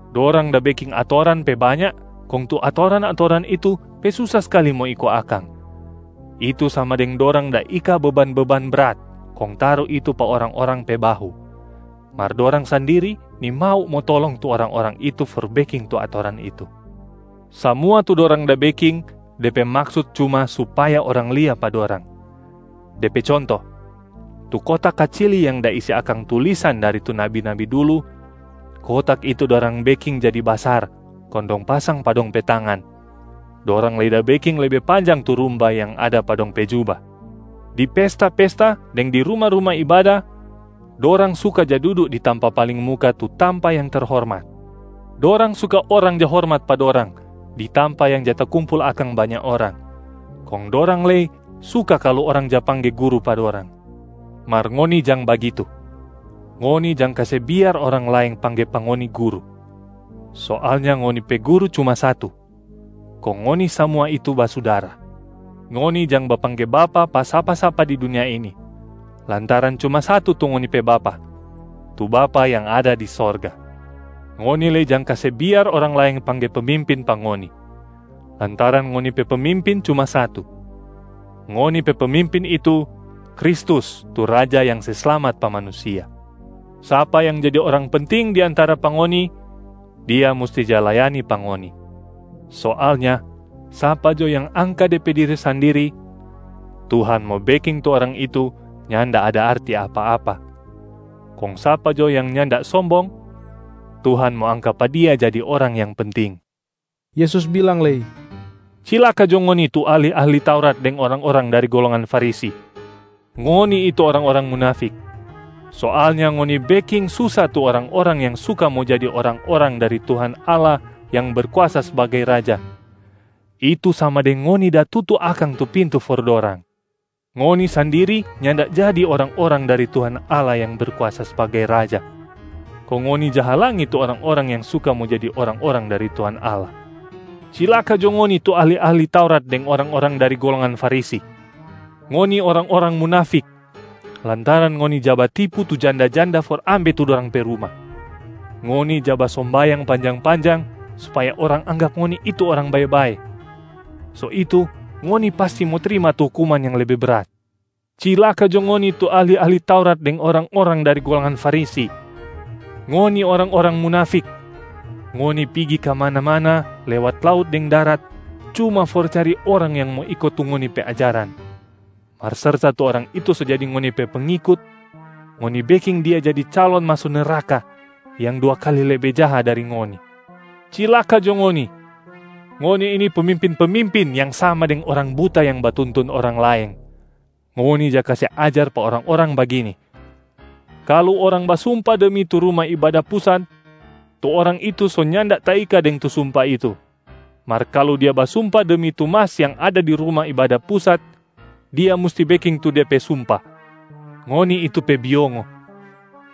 Dorang da beking atoran pe banya kong tu atoran-atoran itu pe susa skali mo iko akang, itu sama deng dorang da ika beban-beban brat kong taru itu pa orang-orang pe bahu, mar dorang sandiri nimau mo tolong tu orang-orang itu for beking tu atoran itu. Samua tu dorang da beking de pe maksut cuma supaya orang lia pa dorang. De pe conto, tu kotak kacili yang da isi akang tulisan dari tu nabi-nabi dulu, kotak itu dorang beking jadi basar kong dong pasang pa dong pe tangan. Dorang lei da beking lebe panjang tu rumbai yang ada pa dong pe juba. Di pesta-pesta deng di ruma-ruma ibada, dorang suka ja dudu di tampa paling muka tu tampa yang terhormat. Dorang suka orang ja hormat pa dorang di tampa yang ja takumpul akang banya orang, kong dorang lei suka kalu orang ja pangge ‘guru’ pa dorang. Mar ngoni jang bagitu! Ngoni jang kase biar orang laeng pangge pa ngoni ‘guru’! Soalnya ngoni pe Guru cuma satu, kong ngoni samua itu basudara. Ngoni jang bapangge ‘bapa’ pa sapa-sapa di dunia ini, lantaran cuma satu tu ngoni pe Bapa, tu Bapa yang ada di sorga. Ngoni lei jang kase biar orang laeng pangge ‘pemimpin’ pa ngoni, lantaran ngoni pe Pemimpin cuma satu. Ngoni pe Pemimpin itu Kristus tu Raja yang se slamat pa manusia. Sapa yang jadi orang penting di antara pa ngoni, dia musti ja layani pa ngoni. Soalnya sapa jo yang angka de pe diri sandiri, Tuhan mo beking tu orang itu nyanda ada arti apa-apa, kong sapa jo yang nyanda sombong, Tuhan mo angka pa dia jadi orang yang penting.” Yesus bilang lei, “Cilaka jo ngoni tu ahli-ahli Taurat deng orang-orang dari golongan Farisi! Ngoni itu orang-orang munafik. Soalnya ngoni beking susa tu orang-orang yang suka mo jadi orang-orang dari Tuhan Allah yang Berkuasa sbagai Raja, itu sama deng ngoni da tutu akang tu pintu for dorang. Ngoni sandiri nyanda jadi orang-orang dari Tuhan Allah yang berkuasa sbagai Raja, kong ngoni ja halangi tu orang-orang yang suka mo jadi orang-orang dari Tuhan Allah. [ Cilaka jo ngoni tu ahli-ahli Taurat deng orang-orang dari golongan Farisi! Ngoni orang-orang munafik, lantaran ngoni ja batipu tu janda-janda for ambe tu dorang pe ruma. Ngoni ja basombayang panjang-panjang supaya orang anggap ngoni itu orang bae-bae. So itu, ngoni pasti mo trima tu hukuman yang lebe brat.] Cilaka jo ngoni tu ahli-ahli Taurat deng orang-orang dari golongan Farisi! Ngoni orang-orang munafik. Ngoni pigi kamana-mana lewat laut deng darat cuma for cari orang yang mo iko tu ngoni pe ajaran. Mar serta tu orang itu so jadi ngoni pe pengikut, ngoni beking dia jadi calon maso neraka yang dua kali lebe jaha dari ngoni. Cilaka jo ngoni! Ngoni ini pemimpin-pemimpin yang sama deng orang buta yang batuntun orang laeng. Ngoni ja kase ajar pa orang-orang bagini, ‘Kalu orang basumpa demi tu Ruma Ibada Pusat, tu orang itu so nyanda taika deng tu sumpa itu. Mar kalu dia basumpa demi tu mas yang ada di Ruma Ibada Pusat, dia musti beking tu de pe sumpa.’ Ngoni itu pe biongo,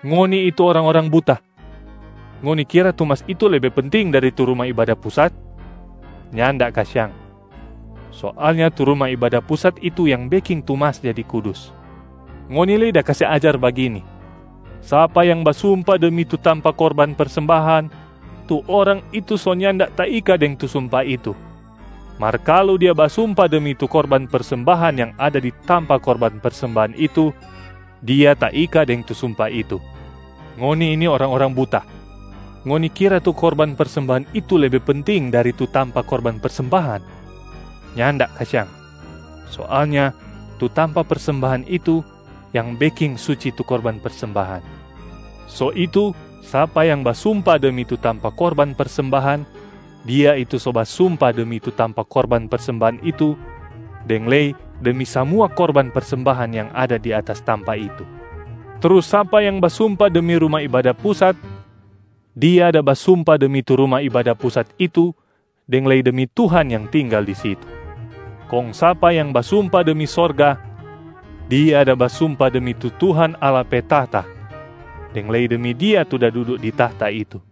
ngoni itu orang-orang buta! Ngoni kira tu mas itu lebe penting dari tu Ruma Ibada Pusat? Nyanda kasiang. Soalnya tu Ruma Ibada Pusat itu yang beking tu mas jadi kudus. Ngoni lei da kase ajar bagini, ‘Sapa yang basumpa demi tu tampa korban persembahan, tu orang itu so nyanda taika deng tu sumpa itu. Mar kalu dia basumpa demi tu korban persembahan yang ada di tampa korban persembahan itu, dia taika deng tu sumpa itu.’ Ngoni ini orang-orang buta! Ngoni kira tu korban persembahan itu lebe penting dari tu tampa korban persembahan? Nyanda kasiang. Soalnya tu tampa persembahan itu yang beking suci tu korban persembahan. So itu sapa yang basumpa demi tu tampa korban persembahan, dia itu so basumpa demi tu tampa korban persembahan itu deng lei demi samua korban persembahan yang ada di atas tampa itu. Trus sapa yang basumpa demi Ruma Ibada Pusat, dia da basumpa demi tu Ruma Ibada Pusat itu deng lei demi Tuhan yang tinggal di situ. Kong sapa yang basumpa demi sorga, dia da basumpa demi tu Tuhan Allah pe tahta deng lei demi Dia tu da dudu di tahta itu.a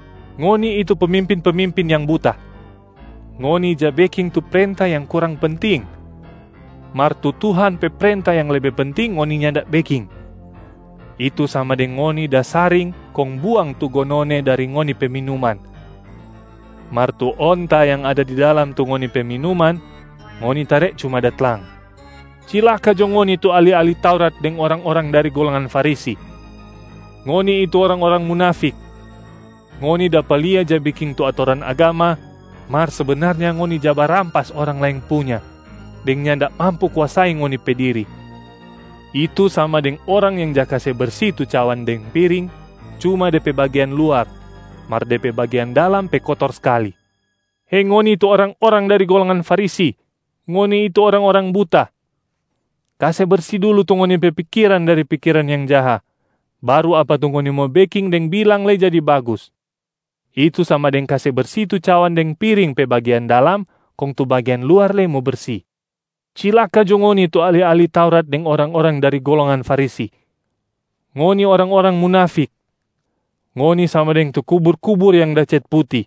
Ngoni itu pemimpin-pemimpin yang buta! Ngoni ja beking tu prenta yang kurang penting mar tu Tuhan pe prenta yang lebe penting ngoni nyanda beking, itu sama deng ngoni da saring kong buang tu gonone dari ngoni pe minuman, mar tu onta yang ada di dalam tu ngoni pe minuman, ngoni tare cuma da tlang. Cilaka jo ngoni tu ahli-ahli Taurat deng orang-orang dari golongan Farisi! Ngoni itu orang-orang munafik. Ngoni dapa lia ja beking tu atoran agama, mar sebenarnya ngoni ja barampas orang laeng punya deng nyanda mampu kuasai ngoni pe diri, itu sama deng orang yang ja kase bersi tu cawan deng piring cuma de pe bagean luar, mar de pe bagian dalam pe kotor skali. Hei ngoni tu orang-orang dari golongan Farisi, ngoni itu orang-orang buta! Kase bersi dulu tu ngoni pe pikiran dari pikiran yang jaha, baru apa tu ngoni mo beking deng bilang lei jadi bagus, itu sama deng kase bersi tu cawan deng piring pe bagean dalam kong tu bagean luar lei mo bersi. Cilaka jo ngoni tu ahli-ahli Taurat deng orang-orang dari golongan Farisi! Ngoni orang-orang munafik. Ngoni sama deng tu kubur-kubur yang da cet puti.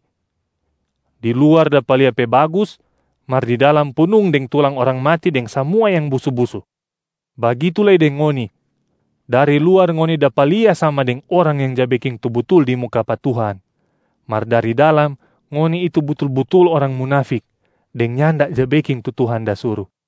Di luar dapa lia pe bagus, mar di dalam punung deng tulang orang mati deng samua yang busu-busu. Bagitu lei deng ngoni, dari luar ngoni dapa lia sama deng orang yang ja beking tu butul di muka pa Tuhan, mar dari dalam ngoni itu butul-butul orang munafik deng nyanda ja beking tu Tuhan da suru.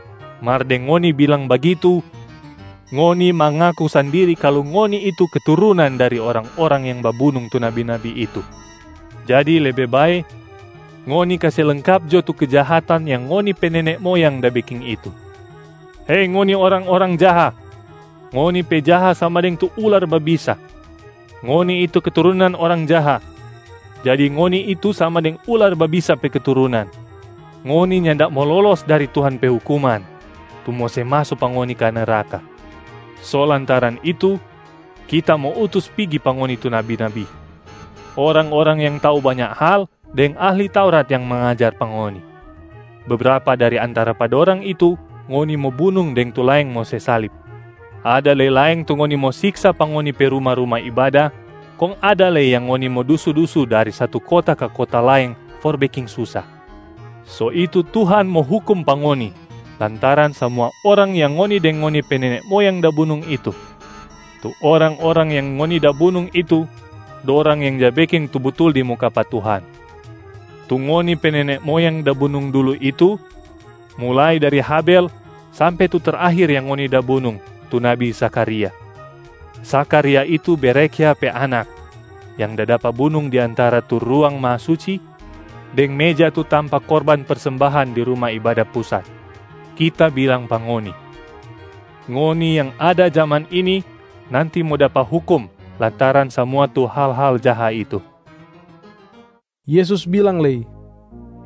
Mar deng ngoni bilang bagitu, ngoni mangaku sandiri kalu ngoni itu keturunan dari orang-orang yang babunung tu nabi-nabi itu. Jadi lebe bae, ngoni kase lengkap jo tu kejahatan yang ngoni pe nene moyang da beking itu! Hei ngoni orang-orang jaha, ngoni pe jaha sama deng tu ular babisa. Ngoni itu keturunan orang jaha, jadi ngoni itu sama deng ular babisa pe keturunan. Ngoni nyanda mo lolos dari Tuhan pe hukuman tu mo se maso pa ngoni ka neraka. So lantaran itu, Kita mo utus pigi pa ngoni tu nabi-nabi, orang-orang yang tau banya hal deng ahli Taurat yang mangajar pa ngoni. Bebrapa dari antara pa dorang itu ngoni mo bunung deng tu laeng mo se salib. Ada lei laeng tu ngoni mo siksa pa ngoni pe ruma-ruma ibada kong ada lei yang ngoni mo dusu-dusu dari satu kota ka kota laeng for beking susa. So itu Tuhan mo hukum pa ngoni lantaran samua orang yang ngoni deng ngoni pe nene moyang da bunung itu. Tu orang-orang yang ngoni da bunung itu, dorang yang ja beking tu butul di muka pa Tuhan. Tu ngoni pe nene moyang da bunung dulu itu mulai dari Habel sampe tu terakhir yang ngoni da bunung tu nabi Zakharia. Zakharia itu Berekhya pe anak yang da dapa bunung di antara tu Ruang Mahasuci deng meja tu tampa korban persembahan di Ruma Ibada Pusat. Kita bilang pa ngoni, ngoni yang ada jaman ini nanti mo dapa hukum lantaran samua tu hal-hal jaha itu.” Yesus bilang lei,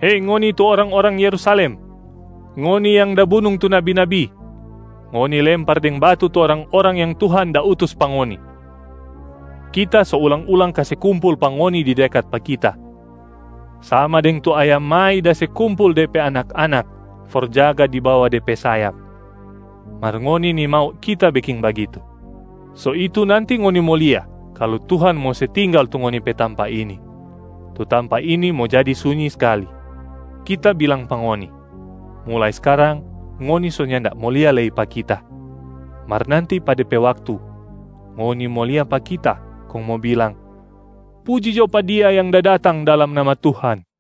“Hei ngoni tu orang-orang Yerusalem! Ngoni yang da bunung tu nabi-nabi, ngoni lempar deng batu tu orang-orang yang Tuhan da utus pa ngoni. Kita so ulang-ulang kase kumpul pa ngoni di dekat pa Kita, sama deng tu ayam mai da se kumpul de pe anak-anak for jaga di bawa de pe sayap, mar ngoni nimau Kita beking bagitu. So itu nanti ngoni mo lia kalu Tuhan mo se tinggal tu ngoni pe tampab ini, tu tampa ini mo jadi sunyi skali. Kita bilang pa ngoni, mulai skarang ngoni so nyanda mo lia lei pa Kita, mar nanti pa de pe waktu, ngoni mo lia pa Kita kong mo bilang, ‘Puji jo pa Dia yang da datang dalam nama Tuhan.’”